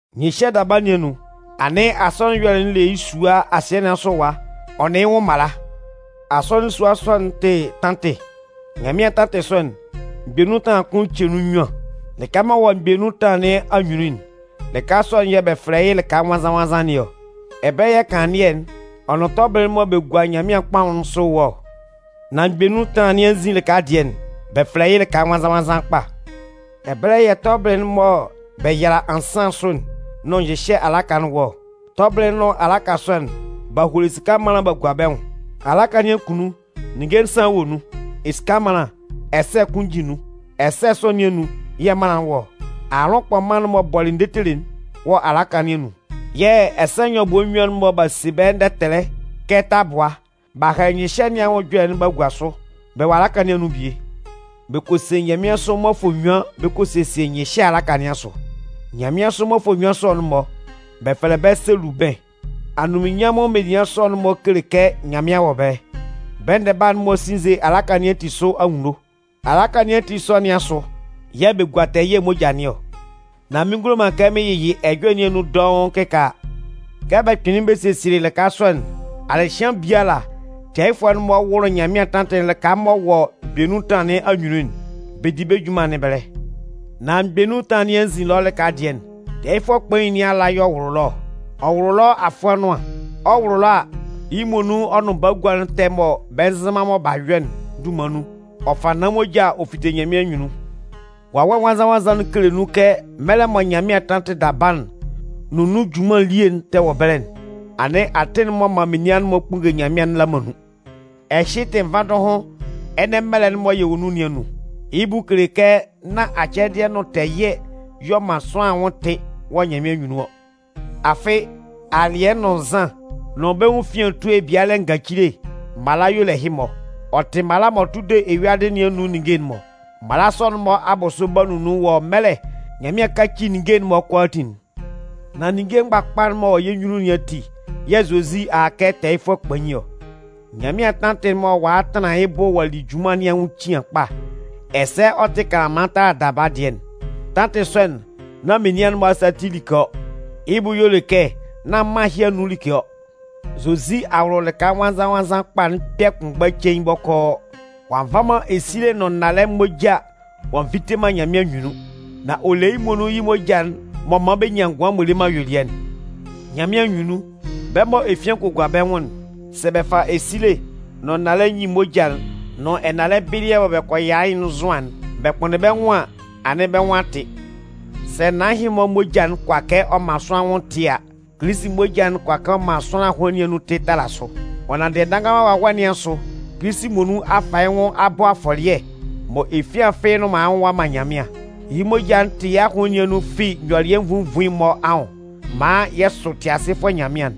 Nyɩhyɛ daba nɩn anun, anɩn asɔnɩn ɛyɔlɛ'n le yɩ́ sua asɩɛ nɩn asʋ ɛwa ɔ nʋn yɩ́ nwʋn mala. Asɔnɩn sua sɔ'n, ɔ tɩ tantɩ. Nyanmɩan tantɩ sɔ'n, mgbɛ nun ɛtanlan kʋn ce nun nnyuan, Lɩka m'ɔ wɔ mgbɛ nun ɛtanlan nɩn anyunnun'n, lɩka sɔ'n yɛ̂ bɛ fɛlɛ yɩ́ lɩka nwannzan-nwannzan nɩn ɔ. Ɛbɛlɛ yɛ̂ kanlannɩɛ'n, ɔ nʋn tɔbɩlɩ'n mɔ bɛ gua Nyanmɩan kpaʋn'n sʋ'n wɔ ɔ. Nan mgbɛ nun ɛtanlan nɩn anzin lɩka dɩɛ'n, bɛ fɛlɛ yɩ́ lɩka nwannzan-nwannzan kpa. Ɛbɛlɛ yɛ̂ tɔbɩlɩ'n mɔ bɛ yala ansan sʋ'n nʋn nyɩhyɛ alaka'n wɔ ɔ. Tɔbɩlɩ'n nʋn alaka sɔ'n, b'a holo esika ɛmanlan b'a gua bɛ nwʋn. Alaka nɩn akunnun, ninnge nsan wa nun. Esika ɛmanlan ɛsɛ̂ kʋn jin nun. Ɛsɛ̂ sɔ nɩn anun yɛ̂ mannan'n wɔ ɔ. Aalʋn kpɔman'n m'ɔ bɔlɩ ndetele'n wɔ alaka nɩn anun. Yɛ̂ ɛsɛ nyɔbʋɛ nnyuan'n mɔ b'a se bɛ́ ndɛtɛlɛ kɛ tabʋa b'a hɛlɛ nyɩhyɛ nɩn anwʋn ɛjɔlɛ'n b'a gua sʋ'n, bɛ wɔ alaka nɩn anun bie. Bɛ kɔ se nyanmɩansʋ mmɔfʋɛ nnyuan bɛ kɔ sesie nyɩhyɛ alaka nɩn asʋ. Nyanmɩansʋ mmɔfʋɛ sɔ'n-mɔ, bɛ fɛlɛ bɛ́ selubɩn. Anunminnyanmʋn menian sɔ'n-mɔ kele kɛ Nyanmɩan wɔ ɛbɛlɛ. Bɛ ndɛba'n-mɔ sinnze alaka nɩn ati sʋ anwunno. Alaka nɩn ati sɔ nɩn asʋ yɛ̂ bɛ gua tɛɛ ɛyɩɛ moja nɩn ɔ. Nan mɩn ngulo man kɛ mɩn yɩyɩ ɛjɔlɛ nɩn anun dɔʋn kɩkaala. Kɛ bɛ kpɩnlɩn bɛ sesielɩ lɩka sɔ'n, alɩhɩan biala, tɛɛyɩfʋɛ'n-mɔ wʋlʋ Nyanmɩan tantɩ'n lɩka m'ɔ wɔ mgbɛ nun ɛtanlan nɩn anyunnun'n, bɛ di bɛ́ junman nɩn ɛbɛlɛ. Nan mgbɛ nun ɛtanlan nɩn anzin ɛlɔ lɩka dɩɛ'n, tɛɛyɩfʋɛ kpain nɩn ala y'ɔ wʋlʋ ɛlɔ ɔ. Ɔ wʋlʋ ɛlɔ afʋɛ nʋan. Ɔ 'wʋlʋ ɛlɔ a, yɩ́ muonun ɔ nʋn bagua'n ɛtɛ mɔ bɛ nzɩ man mɔ b'a yɔ'n dunman nun, ɔ fa naan moja ɔ fite Nyanmɩan anyunnun. Wawɛ Nwannzan-nwannzan'n kele nun kɛ mɛlɛ mɔ Nyanmɩan tantɩ daba'n nʋn nun junman elie'n tɛ wɔ ɛbɛlɛ'n, anɩn atɩn'n m'ɔ man menian'n-mɔ kpunnge Nyanmɩan'n la man nun. Ɛhɩ tɩ nvandʋhʋn ɛnɛ mɛlɛ'n mɔ yɛ wɔ nun nɩn anun. Yɩ́ bʋ kele kɛ nán acɛdɩɛ nʋn tɛɛ ɛyɩɛ y'ɔ man sʋanlan anwʋn tɩ wɔ Nyanmɩan anyunnun ɔ. Afɩ, alɩɛ nʋn nzan nʋn bɛ́ nwʋn efian etue ebialɛ ngacile mala y'ɔ le ɛhɩ-mɔ. Ɔ tɩ mala m'ɔ tʋ de eyuadɩ nɩn anun ninnge'n-mɔ. Mala sɔ'n-mɔ abʋsʋ 'ba nunnun wɔ mɛlɛ Nyanmɩan 'kaci ninnge'n-mɔ kʋalaatin'n. Nan ninnge mgbakpa'n m'ɔ wɔ yɛ́ nyunnun nɩn ati yɛ̂ Zozi a a kɛ tɛɛyɩfʋɛ kpain ɔ. Nyanmɩan tantɩ'n mɔ ɔ'a tanlan yɩ́ bʋ ɔ'a li yɩ́ junman nɩn anwʋn cian kpa, ɛsɛ ɛ tɩ kanlanman tala daba dɩɛ'n. Tantɩ sɔ'n, nán menian'n-mɔ asa ati like ɔ. Yɩ́ bʋ y'ɔ le kɛ nán mân ɛhɩ anun like ɔ. Zozi a wʋlʋ lɩka nwannzan-nwannzan kpa'n kpɛ̂ kʋnmgba cein bɔkɔɔ. Ɔ'a nva man esile nʋn nnalɛ mma moja ɔ'a nvite man Nyanmɩan anyunnun. Nan ɔ le yɩ́ muonun yɩ́ moja'n m'ɔ man bɛ nyan ngʋan m'ɔ le man ayuelɩɛ'n. Nyanmɩan anyunnun, bɛ́ mɔ efian kɔ gua bɛ́ nwʋn'n, sɛ bɛ fa esile nʋn nnalɛ nyin moja'n nʋn ɛnalɛ bɩlɩɛ mɔ bɛ kɔ yala yɩ́'n nzʋan'n bɛ kpʋnndɩn bɛ́ nwʋn an, anɩn bɛ́ nwʋn a tɩ. Sɛ naan ɛhɩ-mɔ moja'n kʋala kɛ ɔ man sʋanlan anwʋn tɩ a, Kilisi moja'n kʋala kɛ ɔ man sʋanlan ahʋnlɩn nɩn anun tɩ tala sʋ! Ɔ nanndɩ Ɛdannganman Wawɛ nɩn asʋ, Kilisi muonun a fa yɩ́ nwʋn ɔ'a bɔ afɔlɩɛ mɔ efian fɩ́ɩ́ nnʋn man yɩ́ nwʋn ɔ'a man Nyanmɩan. Yɩ́ moja'n 'tɩ yɛ́ ahʋnlɩn nɩn anun fi nyɔlɩɛ nvuin nvuin'n-mɔ anwʋn maan yɛ sʋ Tɩasɩfʋɛ Nyanmɩan'n.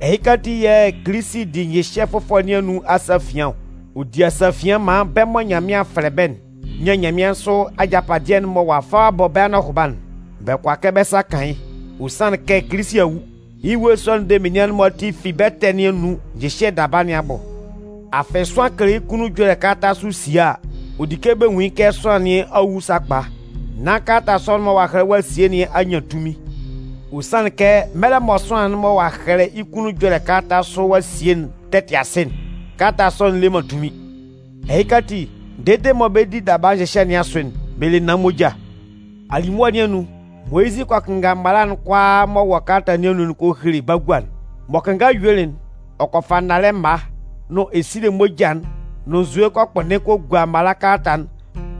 Ɛhɩka ati yɛ̂ Kilisi di nyɩhyɛ fʋfɔlɛ nɩn anun asafian ɔ. Ɔ di asafian maan bɛ́ mɔ Nyanmɩan a fɛlɛ bɛ́'n nyan nyanmɩansʋ ajapadɩɛ'n mɔ ɔ'a fa ɔ'a bɔ bɛ́ anɔhʋba'n. Bɛ kʋala kɛ bɛ́ sa kan yɩ́. Ɔ sanlɩn kɛ Kilisi a wu. Yɩ́ ewue sɔ'n de menian'n-mɔ ati fi bɛ́ ɛtɛ nɩn anun nyɩhyɛ daba nɩn abʋ. Afɩ sʋanlan kɛlɛ yɩ́ kunnun ɛjɔlɛ kalata sʋ sie a, ɔ di kɛ bɛ nwun yɩ́ kɛ sʋanlan nɩn a wu sakpa nán kalata sɔ'n mɔ ɔ'a hɛlɛ ɔ'a sie nɩn a nyan tunmin. Ɔ sanlɩn kɛ mɛlɛ mɔ sʋanlan'n mɔ ɔ'a hɛlɛ yɩ́ kʋnnun ɛjɔlɛ kalata sʋ ɔ'a sie'n tɛ tɩ asɩ'n, kalata sɔ'n le man tunmin. Ɛhɩka ati, dede mɔ bɛ 'di daba nyɩhyɛ nɩn asʋ'n, bɛ le naan moja. Alimʋa nɩn anun, Moyizɩ kɔ kɩnnga mala'n kʋalaa m'ɔ wɔ kalata nɩn anun'n ɔ kɔ hele bagua'n. M'ɔ kɩnngalɩ yuelɩ'n, ɔ kɔ fa nnalɛ mma nʋn esile moja'n nʋn nzue ɔ kɔ kpʋnndɩn kɔ gua mala kalata'n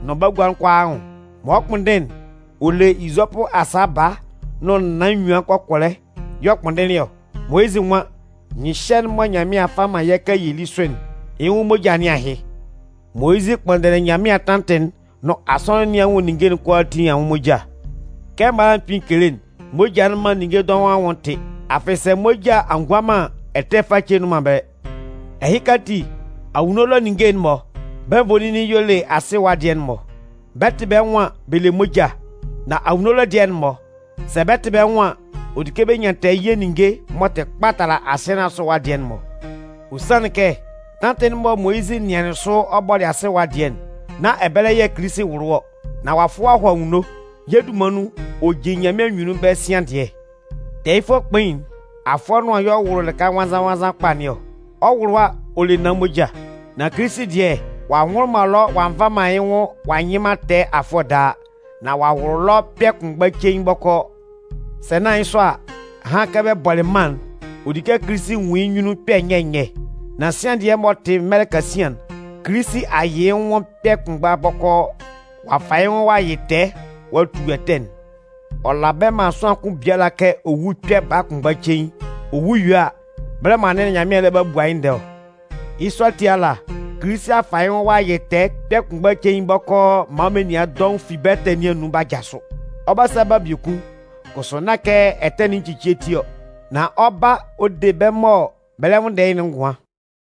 nʋn bagua'n kʋalaa anwʋn. Mɔ ɔ 'kpʋnndɩn'n, ɔ le izɔpʋ asa baa nʋn naan enyuan kɔkɔlɛ y'ɔ kpʋnndɩnlɩn ɔ. Moyizɩ nwan: Nyɩhyɛ'n mɔ Nyanmɩan a fa a man yɛ́ kɛ yɛ lí sʋ'n, yɩ́ nwʋn moja nɩn ahɩ. Moyizɩ kpʋnndɩnlɩn Nyanmɩan tantɩ'n nʋn asɔnɩn nɩn anwʋn ninnge'n kʋalaatin anwʋn moja. Kɛ mala'n kpɩn kele'n, moja'n man ninnge dɔʋn anwʋn tɩ. Afɩ sɛ moja a ngua man an, ɛtɛ face nnʋn man ɛbɛlɛ. Ɛhɩka ati, anwunno ɛlɔ ninnge'n-mɔ, bɛ́ nvoninnin y'ɔ le asɩ ɛwa dɩɛ'n-mɔ. Bɛ 'tɩ bɛ́ nwʋn an, bɛ le moja. Nan anwunno ɛlɔ dɩɛ'n-mɔ, sɛ bɛ 'tɩ bɛ́ nwʋn an, ɔ di kɛ bɛ nyan tɛɛ ɛyɩɛ ninnge m'ɔ tɩ kpa tala asɩɛ nɩn asʋ ɛwa dɩɛ'n-mɔ. Ɔ sanlɩn kɛ tantɩ'n mɔ Moyizɩ nɩanlɩn sʋ ɔ bɔlɩ asɩ ɛwa dɩɛ'n, nán ɛbɛlɛ yɛ̂ Kilisi wʋlʋlɩ ɔ. Nan ɔ'a fʋ ɔ'a hɔ anwunno. Yɛ́ dunman nun, ɔ jin Nyanmɩan anyunnun ɛbɛlɛ sian dɩɛ. Tɛɛyɩfʋɛ kpain'n, afʋɛ nʋan y'ɔ wʋlʋ lɩka nwannzan-nwannzan kpa nɩn ɔ. Ɔ 'wʋlʋ a, ɔ le naan moja. Nan Kilisi dɩɛ, ɔ'a nwʋlʋ man ɛlɔ ɔ'a nva man yɩ́ nwʋn ɔ'a nyɩ man tɛɛ afʋɛ daa. Nan ɔ'a wʋlʋ ɛlɔ kpɛ̂ kʋnmgba cein bɔkɔɔ. Sɛ nán yɩ́ sɔ a, ahan kɛ bɛ bɔlɩ mân'n, ɔ di kɛ Kilisi nwun yɩ́ nyunnun kpɛ̂ nyɛ nyɛ. Nan sian dɩɛ m'ɔ tɩ mɛlɛ kasian'n, Kilisi a yɩ yɩ́ nwʋn kpɛ̂ kʋnmgba bɔkɔɔ. Ɔ'a fa yɩ́ nwʋn ɔ'a yɩ tɛɛ ɔ'a tu ɛtɛ'n. Ɔ la ɛbɛlɛ man sʋanlan kʋn biala kɛ ɔ wú kpɛ̂ baa kʋnmgba cein. Ɔ wu yue a, bɛlɛ mɔ anɩn Nyanmɩan lɛ ba bua yɩ́ ndɛɛ ɔ. Yɩ́ sɔ kʋsʋ ala, Kilisi a fa yɩ́ nwʋn ɔ'a yɩ́ tɛɛ kpɛ̂ kʋnmgba cein bɔkɔɔ maan menian dɔʋn fi bɛ́ ɛtɛ nɩn anun b'a jasʋ. Ɔ 'ba sa ba biekun, kʋsʋ nán kɛ ɛtɛ nɩn ecicie ti ɔ. Nan ɔ 'ba ɔ de bɛ́ mɔ bɛ lɛ nwʋnndɛ yɩ́'n ngʋan.